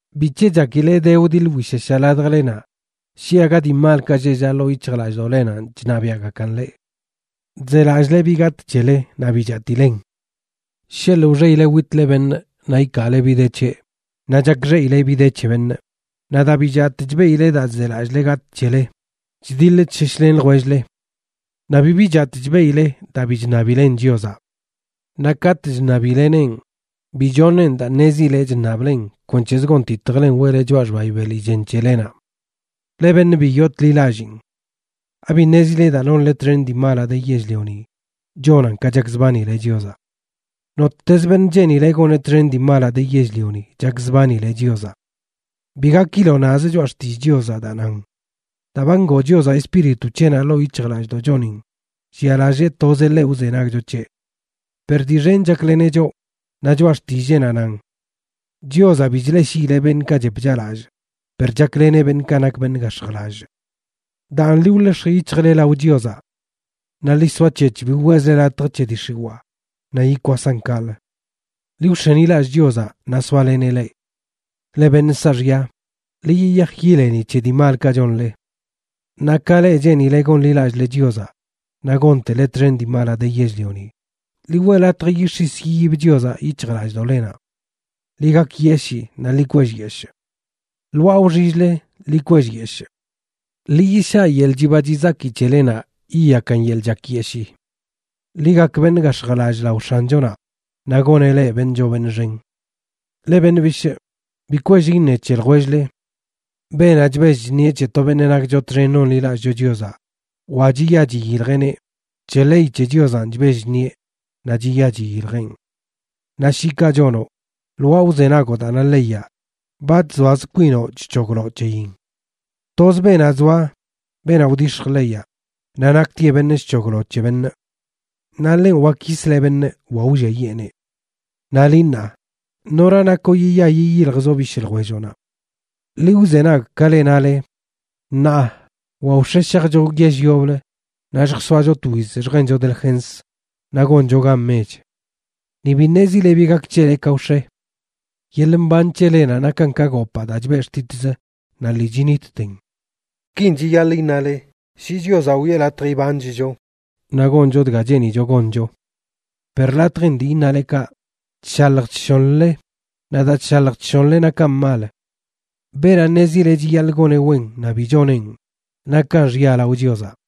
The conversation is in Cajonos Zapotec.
¿Bic̱he chakile de wdiḻ wsheshaꞌ ladjlenaꞌ shi aga dii malkaꞌ lleꞌ llaꞌ ḻoo yic̱hjlallꞌdoꞌlenanꞌ chṉabiaꞌgakan leꞌ? Chzelallꞌle bi gatꞌ c̱hele naꞌ bi chatilen. Sheḻꞌ wxeꞌile witle beṉꞌ naꞌ ikaale bi de c̱heꞌ, naꞌ chakxeꞌileꞌ bi de c̱he beṉꞌ. Naꞌ daa bi chatꞌ chbeꞌile daa chzelallꞌle gatꞌ c̱hele, chdiḻ chsheshlen ljwell-le. Naꞌ bibi chatꞌ chbeꞌile daa bi chṉabilen Chiozaꞌ. Naꞌ katꞌ chṉabileneꞌn, bi choṉeꞌn daa ṉezileꞌ chṉablen kwenc̱hez gonditjlen weꞌle choꞌa xbayi beli chen c̱helenaꞌ. Leꞌ beṉꞌ bi yootḻi lallin. ¿Abi ṉezile daa nonle txen dii malaꞌ de yell-lionin chonan ka chakzbanile Chiozaꞌ? Nottezə beṉꞌ cheenileꞌ goneꞌ txen dii malaꞌ de yell-lioni chakzbanileꞌ Chiozaꞌ. Bi gakiloꞌ nazə Choꞌa Xtillꞌ Chiozaꞌ daa nan: “Daa ba ngoo Chiozaꞌ Espíritu c̱heꞌnaꞌ ḻoo yic̱hjlallꞌdoꞌchonin llialallee tozeꞌ ḻeꞌ wzenagcho c̱heꞌ.” Per dii xen chakleneꞌ choꞌ, naꞌ Choꞌa Xtilleenaꞌ nan: “Chiozaꞌ bi chleꞌshiileꞌ beṉꞌkaꞌ chep chaꞌlallꞌ, per chakleneꞌ beṉꞌkaꞌ nak beṉꞌ gax̱jlallꞌ.” Daan, ḻi wḻex̱j yic̱hjle lao Chiozaꞌ. Naꞌ ḻi soac̱hec̱h bi weꞌzle latj c̱he dii x̱iwaa, naꞌ yikwasan kaꞌlə. Ḻi wx̱enilallꞌ Chiozaꞌ naꞌ soaleneꞌ leꞌ. Leꞌ beṉꞌ saaxya, ḻi yiyaj yileni c̱he dii malkaꞌ chonle. Naꞌ ka leꞌ cheenileꞌ gonḻilallꞌle Chiozaꞌ naꞌ gontele txen dii malaꞌ de yell-lioni, ḻi weꞌ latj yix̱is yiyib Chiozaꞌ yic̱hjlallꞌdoꞌlenaꞌ. Ḻi gakyeshii naꞌ ḻi kwellyeshꞌ. Lwaa wxill-le ḻi kwellyeshꞌ. Ḻi yishaꞌ yeḻꞌ chiba chizaki c̱helenaꞌ yiyakan yeḻꞌ chakyeshii. Ḻi gak beṉꞌ gax̱jlallꞌ lao X̱anchonaꞌ, naꞌ goneꞌ leꞌ beṉꞌ choo beṉꞌ xen. Leꞌ beṉꞌ bishꞌ, bi kwell iṉe c̱he ljwell-le. Beenaꞌ chbell chṉe c̱he to beṉꞌ nakcho txen nonḻilallꞌcho Chiozaꞌ wa chiya chiyiljeꞌneꞌ, c̱he ley c̱he Chiozaꞌn chbell chṉieꞌ naꞌ chiya chiyiljeꞌn. Naꞌ shi kaꞌ chonoꞌ, lwaa wzenagoꞌ daa na leyaꞌ, ba chzoaz kwinoꞌ chc̱hogloꞌ c̱heyin. Toz beenaꞌ zoa, beenaꞌ wdix̱j leyaꞌ, naꞌ naktieꞌ beṉꞌ chc̱hoglo c̱he beṉꞌ. Naꞌ ḻenꞌ wak yisleꞌ beṉꞌ wa wlliayeeneꞌ. Naꞌ liꞌ, ṉaa, ¿nora nakoꞌ yiya yiyiljzoꞌ bishꞌ ljwelloꞌnaꞌ? Ḻi wzenag, ka leꞌ nale: “Ṉaa wa wx̱e shajcho yell yoblə naꞌ lljsoacho twiz lljencho delgens naꞌ goncho gan mech.” Ni bi ṉezile bi gak c̱hele ka wx̱e. Yeḻꞌ mban c̱helenaꞌ nakan ka gopaa daa chbeꞌ xtitz naꞌ lii chinitten. Kin chiyaḻꞌ iṉale: “Shi Chiozaꞌ wiꞌe latj ibanchcho, naꞌ goncho dga cheenicho goncho.” Per latjin dii iṉale kaꞌ, chshalj chshonləle, naꞌ daa chshalj chshonle nakan mal. Beenaꞌ ṉezi chiyaḻꞌ goneꞌ wen naꞌ bi choneꞌn, nakan xya lao Chiozaꞌ.